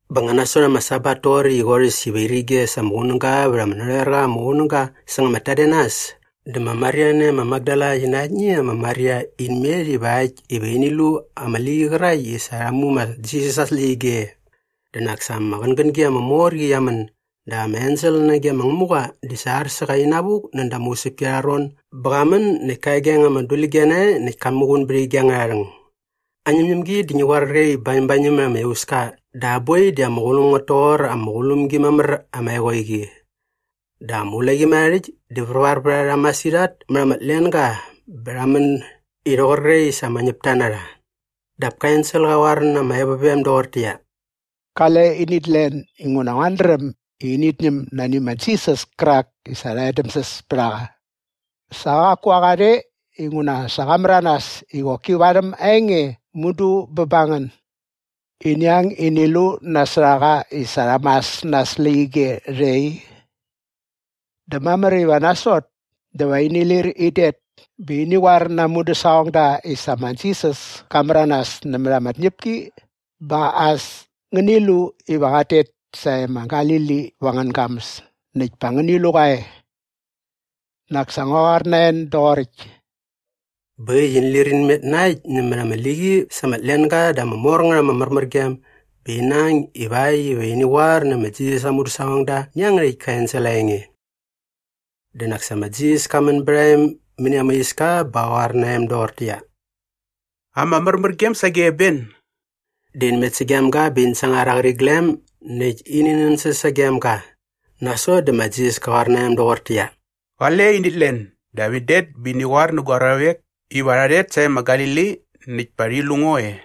Bä nga nasot ama Sabat toqoräkt i qorhäs iva irige sa ama qunäga vät ama narhoer qa ama qunäga säng ama tadenas dä ma Maria nae ma Makdala qi na aktni ma Maria in met ivakt iva ini lu ama liqi qärakt i sa rha mu ma Jisas aa släqyige e. Dä nak sa ama qängängi ama mor qi qia män dap ama ensel nage ma Ngämuqa di sa ar sä qa inavuk näda ama usäpki arha ron bä qa män näkt ka egaeng ama dulige nae näkt ka muqun bät ige angärha rhäng. Aa ñämñämgi di ngi qoar qre bañämbañäm mät ama iauska dä aa boi di ama qulum ngät toqor ama qulum gi mamär ama eqoeqi. Dä ama ulaqimärharhärhäkt di värvar vät a rha masirhat mät ama tlenga bä rha män i rhoqor qre i sa ama ñäpta na rha. Dap ka ensel qa qoar na ama evovem doqortäqyia, “Qale init len inguna nguat dräm i init ñäm nani ma Jisas kärak i sa rha edämsäs pät a qa. Sa qaku a qa rhe inguna sa qa märanas i qoki varhäm aa enge mudu bä bä ngän. Ini ang ini lu nasot a qa i sa rha mas na aa släqyige rhe i. Dä mamär iva nasot dä va ini lir in det bä ini qoar na aa mudäsaqongda i sa ma Jisas ka märanas nämät ama tñäpki bä as ngäni lu iva qat tet sae ma Galili va angän gamäs näkt pa ngäni lu qa e. Nak sa ngua qoar na en doqoräkt.” Bä äkt i in lir in met na äkt nämät ama liqi sa ama tlenga dä ama mor ngät ama märmärgem bä ina ang ivakt iva ini qoar nä ma Jisas aa mudäsaqongda nä iangärhäkt ka ensel aa enge. Dä nak sa ma Jisas ka män bät a em mäni ama iska bä qa qoar na em doqortäqyia, “Ama märmärgem sage ben!” Dä in met sagem ga bä in sangar aa qäriglem näkt ini nänsäs sagem ga. Nasot dä ma Jisas ka qoar na em doqortäqyia, “Qale init len dap in det bä ini qoar nä gua ruavek iva rha rhet sae ma Galili näkt pa rhi lu ngo e.”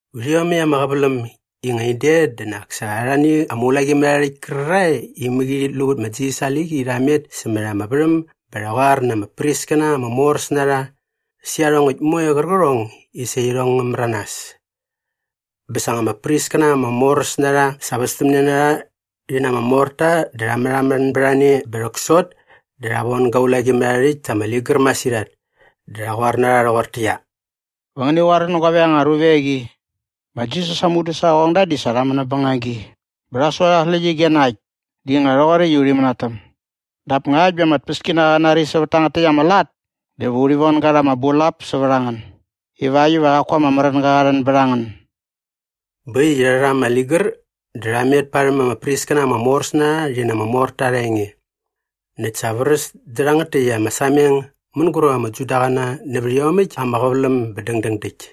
Vät iomäkt ama qäväläm i nga in det dä nak sa arhani ama ulaqimärharhärhäkt kärarhae i mäqi rhit lu vät ma Jisas aa liqi rha met sämät ama värhäm bä rha qoar na ama priskäna ama moräs na rha sä iarhongäkt moe qärqärhong i sa irhong ngä märanas. Bä sa nga ama priskäna ama moräs na rha sa västämne na rha rhi na ama morta dä rha märhamän bät a ne bä rhäksot dä rha von ga ulaqimärharhärhäkt ta ama ligär masirhat dä rha qoar na rha rhoqortäqyia, “Va ngäni qoar nä guavek anga ruvek i, ‘Ma Jisas aa mudäsaqongda di sa rha män näp bängagi bä rha sua rha aa släqyige na äkt i nga rhoqoräkt i urhi mänatäm.’ Dap ngakt bä ama tpäskinaqa qä nari sävät tangät täkt ama lat dä va urhi von ga rha ama bulap sävät a ngän ivakt iva qaku ama märänga qa rhän bät a ngän.” Bä äkt i rha rha ama ligär dä rha met parhäm ama priskäna ama moräs na rha rhi na ama morta arha enge. Näkt sa vräs dä rhangät täkt ama sameng mänguräp ama Judaqäna nävät iomäkt ama qäväläm bä dängdäng däkt.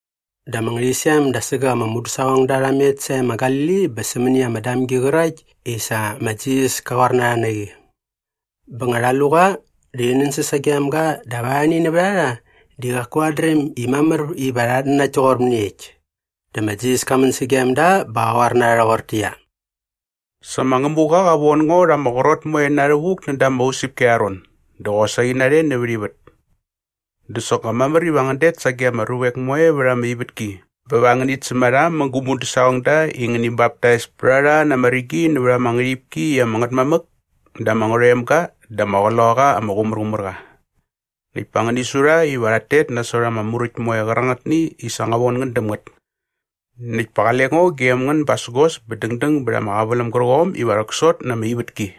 Dä ama ngärhäqyisem da sägäk ama mudäsaqongda rha met sae ma Galili bä sämäni ama damgi qärakt i sa ma Jisas ka qoar na rha na qi. Bä nga rha lu qa dä rhi nänsäs sagem ga dap arhani nävät a rha di qaku rhat dräm i mamär iva rhat nanakt toqor mäniekt. Dä ma Jisas ka män sagem da bä qa qoar na rha rhoqortäqyia, “Sa ma Ngämuqa qa von ngo rha ama qrot moe na rhävuk näda ama usäpki arha ron dä qosaqi narhe nävät ivät. Dä soknga mamär iva ngän det sage ama ruvek moe vät ama ivätki bä va ngänit säm a rha mä gu mudäsaqongda i ngäni baptais pät a rha na ama rigi nävät ama ngärhipki i ama Ngätmamäk dä ama Ngärhoemga dä ama Qloqaqa ama Qumärqumärqa. Näkt pa ngäni su rha iva rhat tet nasot ama muräkt moe qärangätni i sa ngua von ngän däm ngät. Näkt pa qale ngo gem ngän basägos bä dängdäng bät ama qäväläm gärqom iva rhäksot na ama ivätki.”